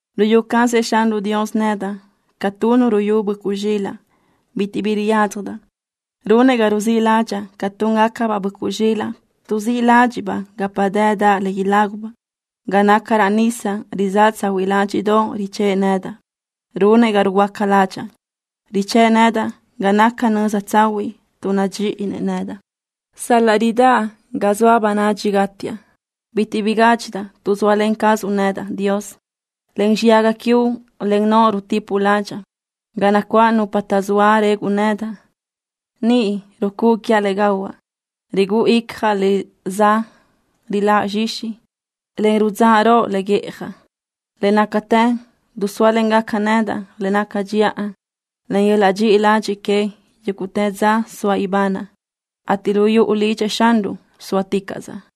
Ruyú cazëʼ Xanruʼ Dios nedaʼ ca tu nu ruyú böʼcuʼ zxilaʼ. Bitiʼ bi riyádzjadaʼ. Runëʼ ga ruzíʼ ládxaʼa ca túngacabaʼ böʼcuʼ zxilaʼ tuʼzíʼ ládxiʼbaʼ gapa dëdaʼ le ilágubaʼ. Ga naca raʼ nisa rizáʼ tsahuiʼ ládxiʼdoʼ richë́ʼë nedaʼ. Runëʼ ga ruhuöáca ládxaʼa. Richë́ʼë nedaʼ ga naca nöza tsahuiʼ tuʼ nadxíʼinëʼ nedaʼ. Sal-laʼ ridáʼ ga zoa bönadxi gátiaʼ, bitiʼ bi gádxidaʼ tuʼ zóalen cazuʼ nedaʼ, Dios. Len xiyaga quiuʼ, en noʼo rutipuʼ ládxaʼa. Ga nacuáʼ nupa taʼzóa reguʼ nedaʼ, niʼ rucúʼu quiaʼ le gahuaʼ. Rigúʼu icjaʼ le za riláʼ zxixi, en ruliruʼ le guíʼjadaʼ. Le nácatë dusóalengaca nedaʼ le naca dxiʼa, en yöl-laʼ dxiʼi ladxiʼ queëʼ yúguʼtë dza soaʼ ibanaʼ, ateʼ lu yuʼu lidxëʼ Xanruʼ sóaticaʼsaʼ.